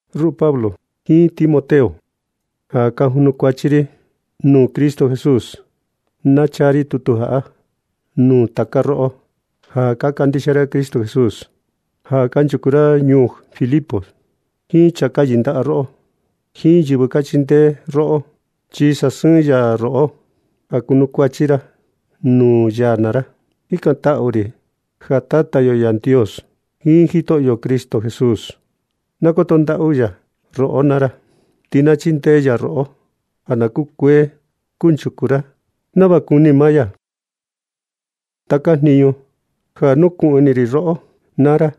Ruꞌu Pablo jiin Timoteo ja ka junukuachi ri nuu Cristo Jesús. Na chaa ri tutu jaꞌa nuu taka roꞌo ja ka kandixia ra Cristo Jesús, ja kanchuku ra ñuu Filipos, jiin chaa ka yɨndaꞌa roꞌo, jiin yɨvɨ ka chindee roꞌo. Chi ni sasɨɨn ya roꞌo ja kunukuachi ra nuu ya naa ra. Jikantaꞌu ri ja Tata yo Yandios jiin Jitoꞌo Cristo Jesús, na koto ndaꞌu ya roꞌo naa ra. Ti na chindee ya roꞌo ja na kukuee kunchuku ra nava kuni maa ya. Taka jinu ja nukuꞌun ini ri roꞌo naa ra,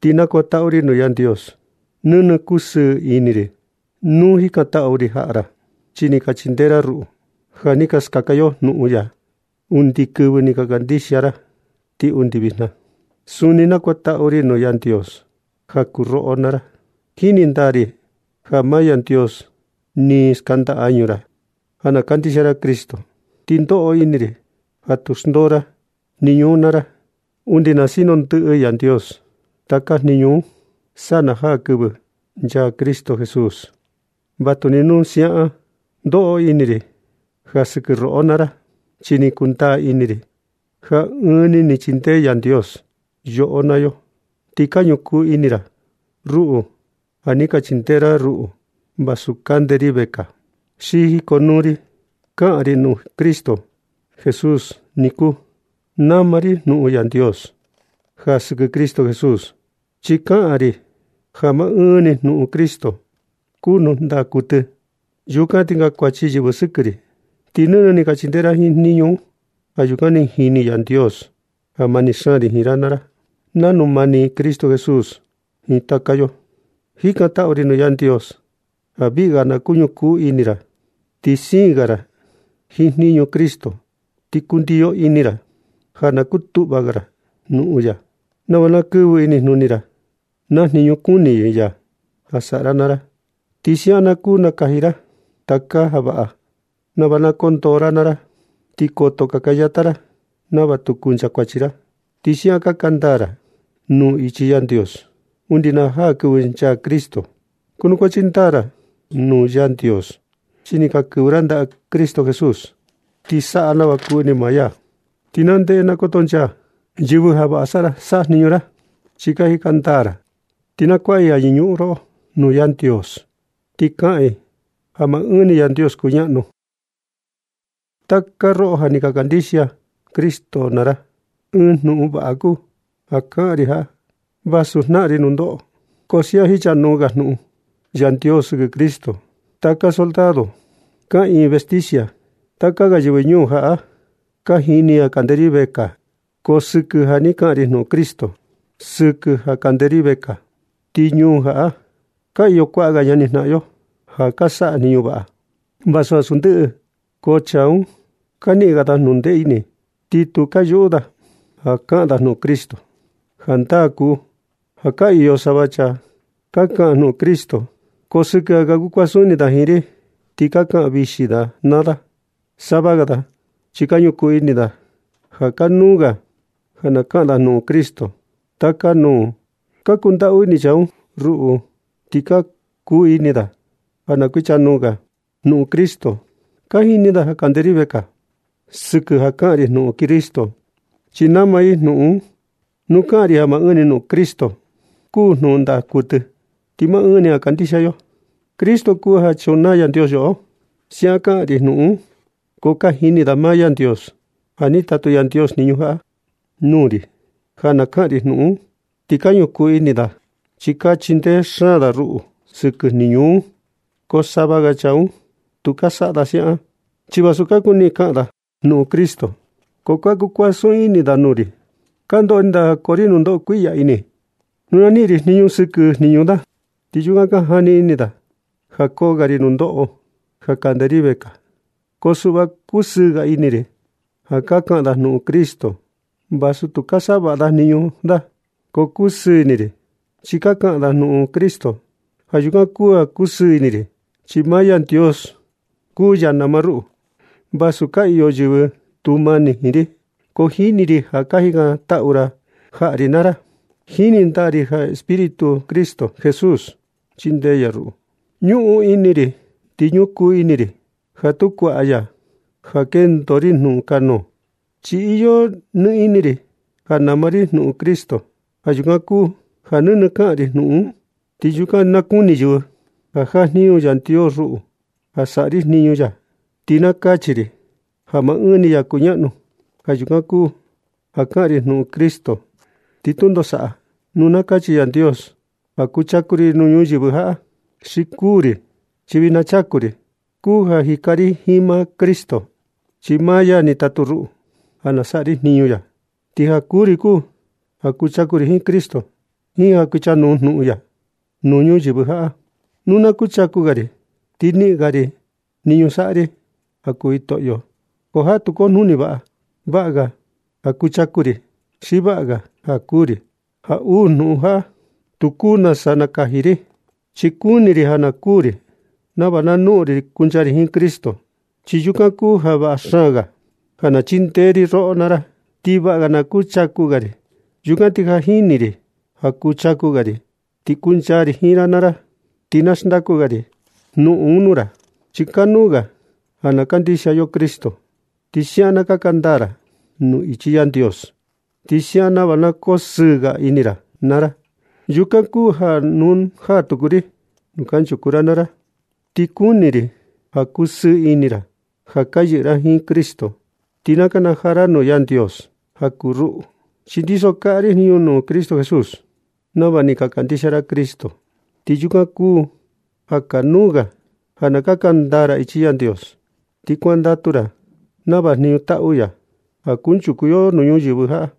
ti nakuantaꞌu ri nuu Yandios. Nɨnɨ kusɨɨ ini ri nuu jikantaꞌu ri jaꞌa ra, chi ni ka chindee ra ruꞌu ja ni ka skaka yo jnuꞌun ya, undi kɨvɨ ni ka kandixia ra ti undi vijna. Suni nakuantaꞌu ri nuu Yandios ja kuu roꞌo naa ra, chi jini ndaa ri ja maa Yandios ni skanda añu ra ja na kandixia ra Cristo. Ti ndoꞌo ini ri ja tu xndoo ra jniñu un naa ra undi na sinu ndɨꞌɨ Yandios taka jniñu un sa na jaa kɨvɨ nchaa Cristo Jesús. Vatuni nu siaꞌan ndoꞌo ini ri ja sɨkɨ roꞌo naa ra, chi ni kundaa ini ri ja ɨɨn ni ni chindee Yandios yoꞌo naa yo. Ti ka ñukuu ini ra ruꞌu ja ni ka chindee ra ruꞌu vasu kande ri vekaa, xi jikonuu ri kaꞌan ri jnuꞌun Cristo Jesús niku. Nama ri jnuꞌun Yandios ja sɨkɨ Cristo Jesús, chi kaꞌan ri ja maa ɨɨn ni jnuꞌun Cristo kuu jnuꞌun ndaa kuɨtɨ. Yukan ti kankuachi yɨvɨ sɨkɨ ri. Ti nɨnɨ ni ka chindee ra jiin jniñu un. Ja yukan ti jini Yandios ja mani xaan ri jiin ra naa ra, nanu mani Cristo Jesús jiin taka yo. Jikantaꞌu ri nuu Yandios ja viꞌi ga na kuñukuu ini ra, ti siin ga ra jiin jniñu Cristo, ti kundio ini ra ja na kutuꞌva ga ra jnuꞌun ya nava na kɨvɨ inijnuni ra naa jniñu kuni ya ja saꞌa ra naa ra. Ti siaꞌan na kuu nakaji ra taka ja vaꞌa nava na koo ndoo ra naa ra, ti koto kakayata ra nava tu kunchakuachi ra. Ti siaꞌan kaka ndaa ra nuu ichi Yandios undi na jaa kɨvɨ nchaa Cristo. Kunukuachi ndaa naa ra nuu Yandios chi ni ka kɨvɨ ra ndaꞌa Cristo Jesús, ti saꞌa nava kuni maa ya. Ti na ndeꞌe na kotonchaa yɨvɨ ja vaꞌa ka saꞌa jniñu ra chi ka jika ndaa ra. Ti na kuaꞌa i ja yɨñuꞌun roꞌo nuu Yandios, ti kaꞌan i ja maa ɨɨn ni Yandios kuñaꞌnu. Taka roꞌo ja ni ka kandixia Cristo naa ra, ɨɨn jnuꞌun vaꞌa kuu ja kaꞌan ri jaꞌa. Vasu jnaꞌan ri nundoꞌo, ko siaꞌan jichanuu ga jnuꞌun Yandios sɨkɨ Cristo. Taka soldado kaꞌiin vestisia jiin taka ga yɨvɨ ñuu jaꞌa, ka jini i ja kande ri vekaa, ko sɨkɨ ja ni kaꞌan ri jnuꞌun Cristo. Sɨkɨ ja kande ri vekaa, ti ñuu jaꞌa ka iyo kuaꞌa ga ñani jnaꞌan yo ja ka saꞌa jniñu vaꞌa, vasu ansu ndɨꞌɨ. Ko chaa un ka niꞌin ga da jnuꞌun ndee ini, ti tu ka yuꞌu da ja kaꞌan da jnuꞌun Cristo. Jandaa kuu ja ka iyo sava chaa ka kaꞌan jnuꞌun Cristo, ko sɨkɨ ja ka kukuasun ini da jiin ri, ti ka kaꞌan vixi da naa da. Sava ga da chi ka ñukuu ini da ja kanuu ga ja na kaꞌan da jnuꞌun Cristo taka nuu. Ka kundaꞌu ini chaa un ruꞌu ti ka kuni da ja na kuichanuu ga jnuꞌun Cristo. Ka jini da ja kande ri vekaa sɨkɨ ja kaꞌan ri jnuꞌun Cristo, chi nama ri jnuꞌun un nu kaꞌan ri ja maa ɨɨn ni jnuꞌun Cristo kuu jnuꞌun ndaa kuɨtɨ. Ti maa ɨɨn ni ja kandixia yo Cristo kuu ja chunaa Yandios yoꞌo. Siaꞌan kaꞌan ri jnuꞌun. Ko ka jini da maa Yandios ja ni tatu Yandios jniñu jaꞌa nuu ri ja na kaꞌan ri jnuꞌun un, ti ka ñukuu ini da chi ka chindee xaan da ruꞌu sɨkɨ jniñu un. Ko sava ga chaa un tu ka saꞌa da siaꞌan, chi vasu ka kuni da kaꞌan da jnuꞌun Cristo, ko ka kuasun ini da nuu ri. Ka ndoꞌo ini da ja koo ri jnuꞌun kuiꞌya ini nu na niꞌin ri jnuꞌun sɨkɨ jniñu da. Ti yukan ka jani ini da ja koo ga ri nundoꞌo ja kande ri vekaa. Ko suꞌva, kusɨɨ ga ini ri ja ka kaꞌan da jnuꞌun Cristo. Vasu tu ka saꞌa vaꞌa da jniñu da, ko kusɨɨ ini ri chi ka kaꞌan da jnuꞌun Cristo. Ja yukan kuu ja kusɨɨ ini ri, chi maa Yandios kuu ya nama ruꞌu. Vasu ka iyo yɨvɨ tu mani jiin ri, ko jini ri ja ka jikantaꞌu ra jaꞌa ri naa ra. Ti jini ndaa ri ja Espíritu Cristo Jesús chindee ya ruꞌu. Ñuꞌun ini ri ti ñukuu ini ri ja tu kuaꞌa ya jnuꞌun ja kendo ri nukanuu. Chi iyo nɨ ini ri ja nama ri jnuꞌun Cristo. Ja yukan kuu ja nɨnɨ kaꞌan ri jnuꞌun un. Yukan ti na kuni yɨvɨ ja jajniñu Yandios ruꞌu ja saꞌa ri jniñu ya, ti na kachi i ja maa ɨɨn ni ya kuñaꞌnu. Ja yukan kuu ja kaꞌan ri jnuꞌun Cristo, ti tundo saꞌa nu na kachi Yandios ja kuchaku ri nuu ñuyɨvɨ jaꞌa xi kuu ri. Chi vijna chaku ri kuu ja jika ri jiin maa Cristo, chi maa ya ni tatu ruꞌu ja na saꞌa ri jniñu ya. Ti ja kuū ri kuu ja kuchaku ri jiin Cristo jiin ja kuichanuu jnuꞌun ya nuu ñuyɨvɨ jaꞌa. Nu na kuchaku ga ri ti niꞌin ga ri jniñu saꞌa ri ja kuu Jitoꞌo. Ko jaꞌa tu kojnuni nau ja vaꞌa ga. Vaꞌa ga ja kuchaku ri xi vaꞌa ga ja kuū ri. Ja uu jnuꞌun jaꞌa, tu kuu nasa nakaji ri, chi kuni ri ja na kuū ri nava na noꞌon ri kuncha ri jiin Cristo, chi yukan kuu ja vaꞌa xaan ga. Ko ja na chindee ri roꞌo naa ra, ti vaꞌa ga ja na kuchaku ga ri. Yukan ti ja ni jini ri ja kuchaku ga ri ti kuncha ri jiin ra naa ra. Ti na xndaku ga ri jnuꞌun un nuu ra, chi kanuu ga ja na kandixia yo Cristo, ti siaꞌan na kaka ndaa ra nuu ichi Yandios, ti siaꞌan nava na kosɨɨ ga ini ra naa ra. Yukan kuu ja nu na jaa tuku ri nuu kanchuku ra naa ra, ti kuni ri ja kusɨɨ ini ra ja ka yɨꞌɨ ra jiin Cristo. Ti na nakanajaa ra nuu Yandios ja kuu ruꞌu, chi ndiso ri jniñu ja kaꞌan ri jnuꞌun Cristo Jesús. Nava ni ka kandixia ra Cristo, ti yukan kuu ja kanuu ga ja na kaka ndaa ra ichi Yandios, ti kuandatu ra nava jniñu taꞌu ya ja kunchuku yo nuu ñuyɨvɨ jaꞌa.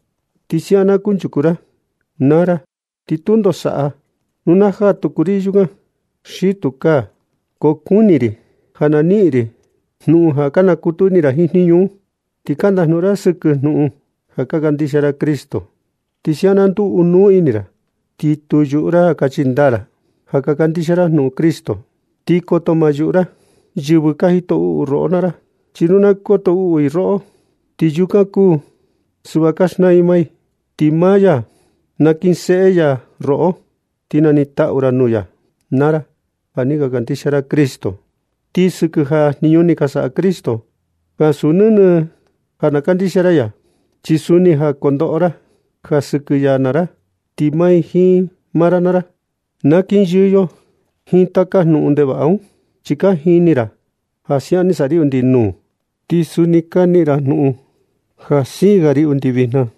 Nu siaꞌan na kunchuku ra, naa ra ti tundo saꞌa nu na jaa tuku ri yukan xi tukaa. Ko kuni ri ja na niꞌin ri jnuꞌun ja ka nakutu ini ra jiin jniñu un. Ti ka ndajnuꞌun ra sɨkɨ jnuꞌun ja ka kandixia ra Cristo. Ti siaꞌan na nduu ɨɨn nuu ini ra, ti tu yuꞌu ra ja kachi ndaa ra ja ka kandixia ndaa ra jnuꞌun Cristo. Ti koto ma yuꞌu ra yɨvɨ ka jito uꞌu roꞌo naa ra, chi nu na koto uꞌu i roꞌo, ti yukan kuu ja suꞌva ka xnaa i maa i. Ti maa ya nakinseꞌe ya roꞌo, ti nanitaꞌu ra nuu ya naa ra ja ni ka kandixia ra Cristo. Ti ja sɨkɨ jniñu ni saꞌa Cristo, ansu nɨnɨ ja na kandixia ra ya, chi suni ja na kondoꞌo ra ja sɨkɨ ya naa ra. Ti maa ri jiin maa ra naa ra, na kinyɨɨ yo jiin taka jnuꞌun ndevaꞌa un. Chi ni ka jini ra ja siaꞌan ni saꞌa ri undi nuu, ti suni ka niꞌin ra jnuꞌun ja siin ga ri undi vijna.